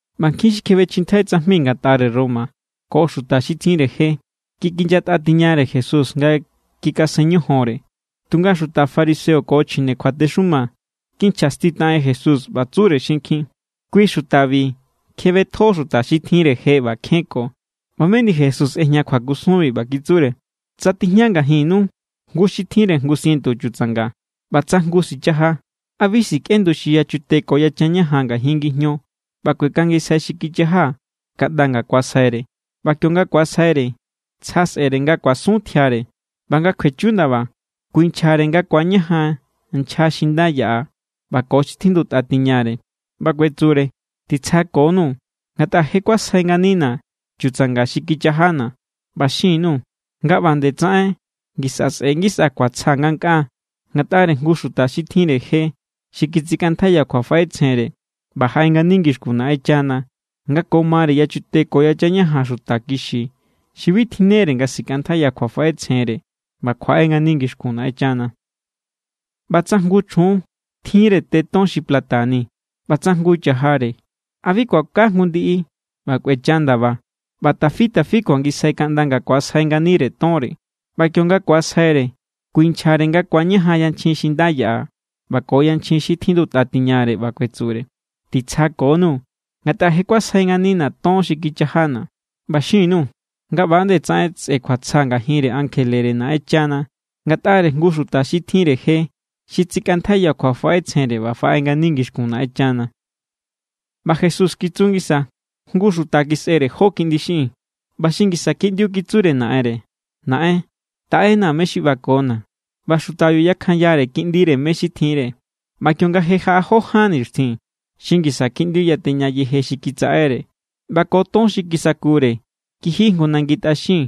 ꞌBa nkjin xi kjebechjintjai tsajmi ngatꞌare Roma ko xuta xi tjinre je kikinyatꞌa tiñare Jesús nga kikasen ñojonre. Tunga xuta fariseo ko chjine kjuatexuma kinchjastitaꞌen Jesús, ꞌba tsure xinkjin: —Kui xutabi kjebetjo xuta xi tjinre je ꞌba kjenko. ꞌBa meni Jesús ꞌejña kjuakusunbi, ꞌba kitsure: —Tsa tijña ngajinnu jngu xi tjinre jngu sientu chutsanga, ꞌba tsa jngu sichaja, ¿a bi sikꞌendu xi yachute ko yachan ñajan ngajin ngijño ꞌba kuekangisjai xi kichaja kaꞌnda nga ku̱asjaire? ꞌBa kionga ku̱asjaire, tsja sꞌe̱re nga kuasun tjiare. ꞌBa nga kjuechu ndaba, kuinchjare nga ku̱añajan nchja xi nda yaꞌa ꞌba ko xi tjindutꞌa tiñare, ꞌba kuetsure: “Titsjakonu, ngatꞌa je kuasjai nganina̱ chutsanga xi kichajana̱.” ꞌBa xin_nuu̱ nga ꞌba nde tsaꞌen ngisa sꞌe ngisa kjuatsja ngankꞌaa ngatꞌare jngu xuta xi tjinre je xi kitsikꞌantjaiya kjuafaꞌetsjenre ꞌba jaꞌe ngani ngixkun Naꞌenchana nga ko mare yachute ko yachan ñajan xuta kixi xi bi tjinnere nga sikꞌantjaiya kjuafaꞌetsjenre ꞌba kjuaꞌe ngani ngixkun Naꞌenchana. ’ꞌBa tsa jngu chjun tjinre te ton xi plata nini ꞌba tsa jngu cha̱jare, ¿a bi kuaka jngu ndiꞌi ꞌba kꞌuecha ndaba, ꞌba tafi tafi kuangisjai kaꞌnda nga ku̱asjai nganire tonre? ꞌBa kionga ku̱asjaire, kuinchjare nga ku̱añajan yanchjin xi nda yaꞌa ꞌba ko yanchjin xi tjindutꞌa tiñare, ꞌba kuetsure: “Titsjakonu, ngatꞌa je kuasjai nganina̱ ton xi kichajana̱.” ꞌBa xin_nuu̱ nga ꞌba nde tsaꞌen sꞌe kjuatsja ngajinre ankjelere Naꞌenchana ngatꞌare jngu xuta xi tjinre je xi tsikꞌantjaiya kjuafaꞌetsjenre ꞌba faꞌe ngani ngixkun Naꞌenchana. ꞌBa Jesús kitsu ngisa: —Jngu xuta kisꞌere jó kiꞌndi xiꞌin. ꞌBa xi ngisa kiꞌndiu kitsure naꞌenre: “Naꞌen, taꞌena mé= xi ꞌbakona̱.” ꞌBa xutabiu yakjanyare kiꞌndire mé= xi tjinre. ꞌBa kionga je jaꞌa jó ján nixtjin, xi ngisa kiꞌndiu yateña yeje xi kitsaꞌere. ꞌBa ko ton xi kisakure kiji jngu nangi tꞌaxin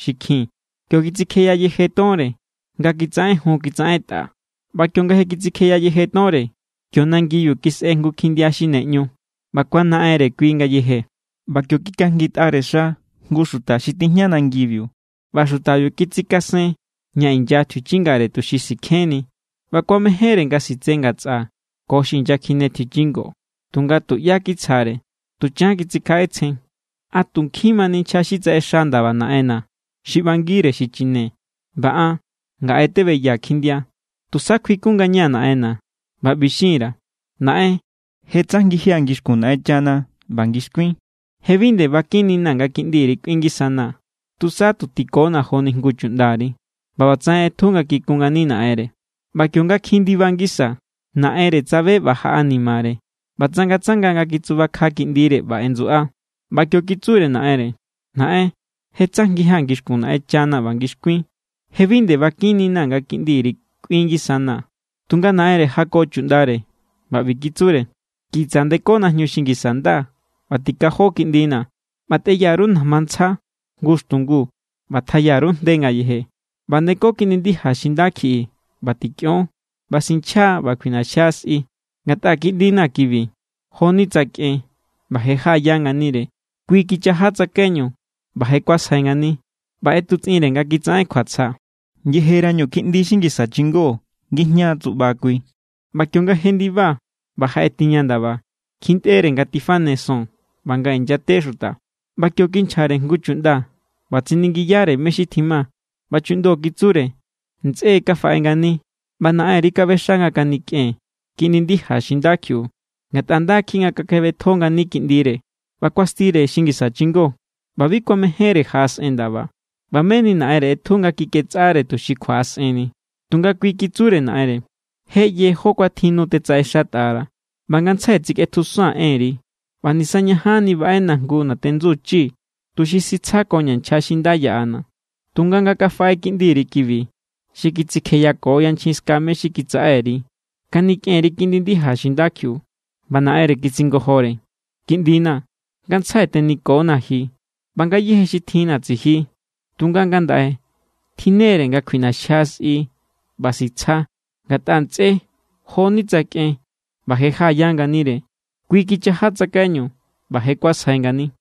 xi kjin. Kio kitsikjeya yeje tonre nga kitsaꞌenjun kitsaꞌentꞌa. ꞌBa kionga je kitsikje yeje tonre, kio nangibiu kisꞌe jngu kjindia xi ne ꞌñu, ꞌba kuanaꞌenre kui ngayeje. ꞌBa kio kikajngitꞌare xa jngu xuta xi tijña nangibiu, ꞌba xutabiu kitsikasen ña inya tjiuchingare, tuxi sikjenni. ꞌBa kuamejénre nga sitse ngatsꞌa ko xi inyakjine tjiuchingo, tunga tuꞌyá kitsjare. Tuchan kitsikjaꞌetsjen: “¡A tu nkjin mani nchja xi tsaꞌexa ndaba naꞌenna̱ xi ꞌbangire xichine, ꞌba an ngaꞌe tebeyaa̱ kjindia! Tusa kjuikun ngañaa̱ naꞌenna̱ ꞌba ꞌbi xin_ra̱: Naꞌen, je tsajngijia̱ ngixkun Naꞌenchana ꞌba ngixkuin. Je bi nde ꞌba kꞌinnina̱ nga kiꞌndiri kꞌuin ngisanaa̱. Tusa tu tikona joni jngu chuꞌndari.” ꞌBa ꞌbatsaꞌen ꞌetju nga kikun ngani naꞌenre. ’ꞌBa kionga kjin ndiba ngisa, naꞌenre tsabe ꞌba jaꞌanimare ꞌba tsangatsanga nga kitsubakja kiꞌndire ꞌba ꞌendsuꞌa. ꞌBa kio kitsure naꞌenre: “Naꞌen, je tsajngijia̱ ngixkun Naꞌenchana ꞌba ngixkuin. Je bi nde ꞌba kꞌinnina̱ nga kiꞌndiri kꞌuin ngisanaa̱.” Tunga naꞌenre jako chuꞌndare, ꞌba ꞌbi kitsure: “Kitsa ndeko najñu xi ngisa nda ꞌba tikajo kiꞌndina̱, ꞌba nde tꞌeya_ru najma ntsja jngu xtungu, ꞌba tjaya_ru jnde ngayeje. ꞌBa ndeko kiꞌndi ndija xi nda kjiꞌi ꞌba tikꞌion. ꞌBa sinchja ꞌba kjuiꞌnaxjia sꞌi. Ngatꞌa kiꞌndina̱ kibi joni tsa kꞌen ꞌba je jaꞌaya nganire. Kui kichaja tsakaiñu ꞌba je kuasjai ngani.” ꞌBa ꞌetutsꞌinre nga kitsaꞌen kjuatsja. ’Yejerañu kiꞌndi xi ngisa chingó ngijñaa tsuꞌba kui. ꞌBa kionga jendiba ꞌba jaꞌe tiña ndaba, kjintꞌere nga tifane son ꞌba nga inyate xuta. ꞌBa kio kinchjare jngu chuꞌnda ꞌba tsiningiyare mé= xi tjima. ꞌBa chuꞌndo kitsure: “Ntsꞌé= kafaꞌe ngani, ꞌba naꞌenri kaꞌbexa nga kanikꞌen kiꞌndi ndija xi nda kjiꞌiu, ngatꞌa nda kjiꞌi nga kakjebetjo ngani kiꞌndire.” ꞌBa kuastire kiꞌndi xi ngisa chingó, ꞌba bi kuamejénre jaꞌasꞌen ndaba. ꞌBa meni naꞌenre ꞌetju nga kiketsꞌare tuxi kjuaꞌasꞌenni. Tunga kui kitsure naꞌenre: “Je ꞌye jó kuatjin nu tetsaꞌexatꞌara̱, ꞌba ngantsjai tsikꞌetjusaa̱n enri, ꞌba nisa ñajanni baꞌena jngu natendsu chi tuxi sitsjakoña̱ nchja xi nda yaꞌana̱. Tunga nga kafaꞌe kiꞌndiri kibi, xi kitsikjeyako yanchjin ska mé= xi kitsaꞌe_ri, kanikꞌen_ri kiꞌndi ndija xi nda kjiꞌiu.” ꞌBa naꞌenre kitsingojore: “Kiꞌndina̱, ngantsjai tenikonaa̱ ji, ꞌba ngayéje xi tjinna̱ tsiji. Tunga ngandaꞌe tjinnere nga kjuiꞌnaxjia sꞌi ꞌba sitsja, ngatꞌa ntsꞌé jo=ni tsa kꞌen ꞌba je jaꞌaya nganire. Kui kichaja tsakaiñu ꞌba je kuasjai ngani.”